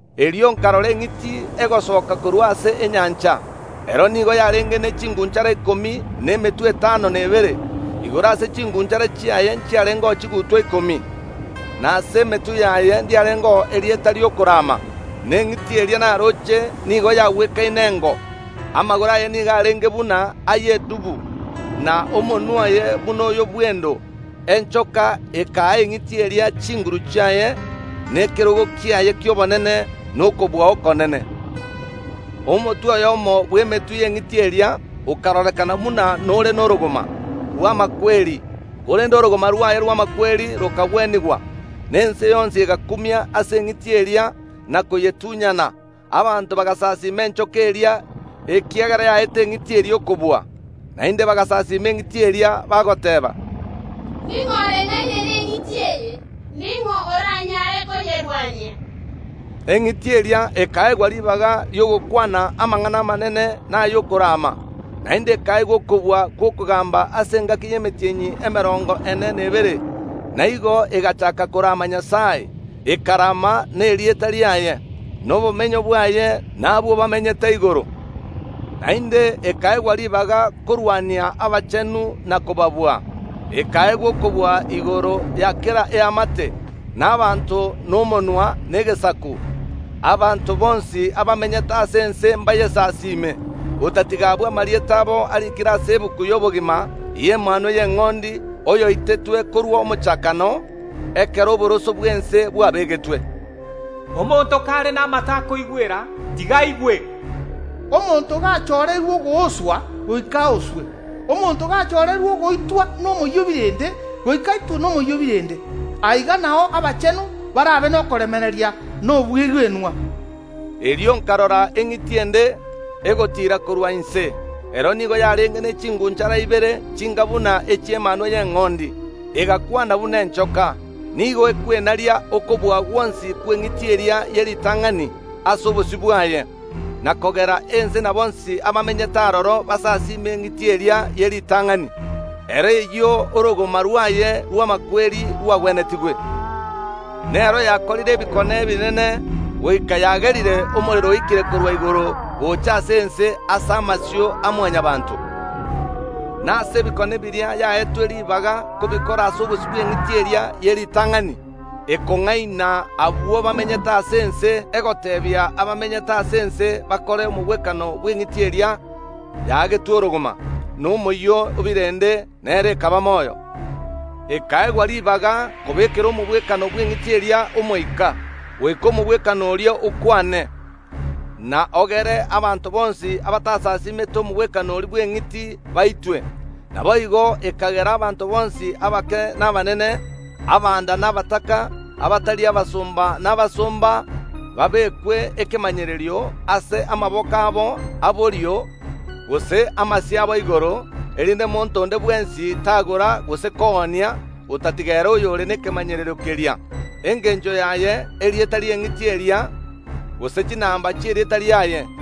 Erio nkarora eng’iti egosoka korwa ase enyancha. Ero nigo yarenge ne ching’unchara ikomi na emetwe etano na ebere. Igoro ase ching’unchara chiaye nchiarengeo chigutwa ikomi, na ase emetwe yaye ndiarengeo erieta ri’okoraama. Na eng’iti eria narooche nigo yagwekaine engo. Amagoro aye nigo arenge buna ay’edubu, na omonwa oye buna oyo bw’endo. Enchoka ekaa eng’iti eria chinguru chiaye, na ekerogo kiaye ki’obonene, na okobua okonene. Omotwe oyomo bw’emetwe y’eng’iti eria okarorekana buna nore norogoma rw’amakweri, korende orogoma rwaye rw’amakweri rokagwenigwa, na ense yonsi egakumia ase eng’iti eria na koyetunyana. Abanto bagasasiima enchoka eria, ekiagera yaete eng’iti eria okobua. Naende bagasasiima eng’iti eria bagoteeba, “Ning’o oreng’aine neng’iti eye? Ning’o oranyare koyerwania?” Eng’iti eria ekaegwa ribaga ri’ogokwana amang’ana amanene na ay’okorama, naende ekaegwa okobua gw’okogamba ase engaki y’emetienyi emerongo ene na ebere. Na igo egachaaka korama Nyasae, ekarama na erieta riaye, na obomenyo bwaye, na abwo bamenyete igoro, naende ekaegwa ribaga korwania abachenu na kobabua. Ekaegwa okobua igoro ya kera eamate, na abanto, na omonwa, na egesaku. Abanto bonsi abamenyete ase ense mbayesasime, otatiga abwo amarieta abo ariikire ase egetabu y’obogima y’Emanwa y’Eng’ondi, oyoitetwe korwa omochakano, ekero oboroso bw’ense bwabegetwe. Omonto kare namato akoigwera, tiga aigwe: Omonto gachoreirwe ogwoswa, goika oswe. Omonto gachoreirwe ogoitwa nomoyio o birende, goika aitwe nomoyio o birende. Aiga nao abachenu barabe nokoremereria na obwegenwa. Erio nkarora eng’iti ende egotiira korwa inse. Ero nigo yarenge ne ching’unchara ibere chinga buna echi’emanwa y’eng’ondi, egakwana buna enchoka. Nigo ekwenaria okobua gwonsi kw’eng’iti eria ye ritang’ani ase obosio bwaye, na kogera ense na bonsi abamenyete aroro basasime eng’iti eria ye ritang’ani, ero eyio orogoma rwaye rw’amakweri rwagwenetigwe. Nero yakorire ebikone ebinene, goika yagerire omorero oike korwa igoro gocha ase ense ase amasio a Mwanyabaanto. Na ase ebikone biria yaetwe ribaga kobikora ase obosio bw’eng’iti eria ye ritang’ani ekong’aina abwo bamenyete ase ense, egoteebia abamenyete ase ense bakore omogwekano bw’eng’iti eria yaagetwe orogoma nomoyio o birende, nero ekaba moyo. Ekaegwa ribaga kobekera omogwekano bw’eng’iti eria omoika, goika omogwekano oria okwane, na ogere abanto bonsi abatasasimete omogwekano oria bw’eng’iti baitwe. Naboigo ekagera abanto bonsi, abake na abanene, abanda na abataka, abatari abasomba na abasomba, babekwe ekemanyererio ase amaboko abo a borio gose amasio abo igoro, erinde monto onde bwensi tagora gose koonia otatiga ere oyore nekemanyererio keria, engencho yaye erieta ri’eng’iti eria gose chinamba chi’erieta riaye.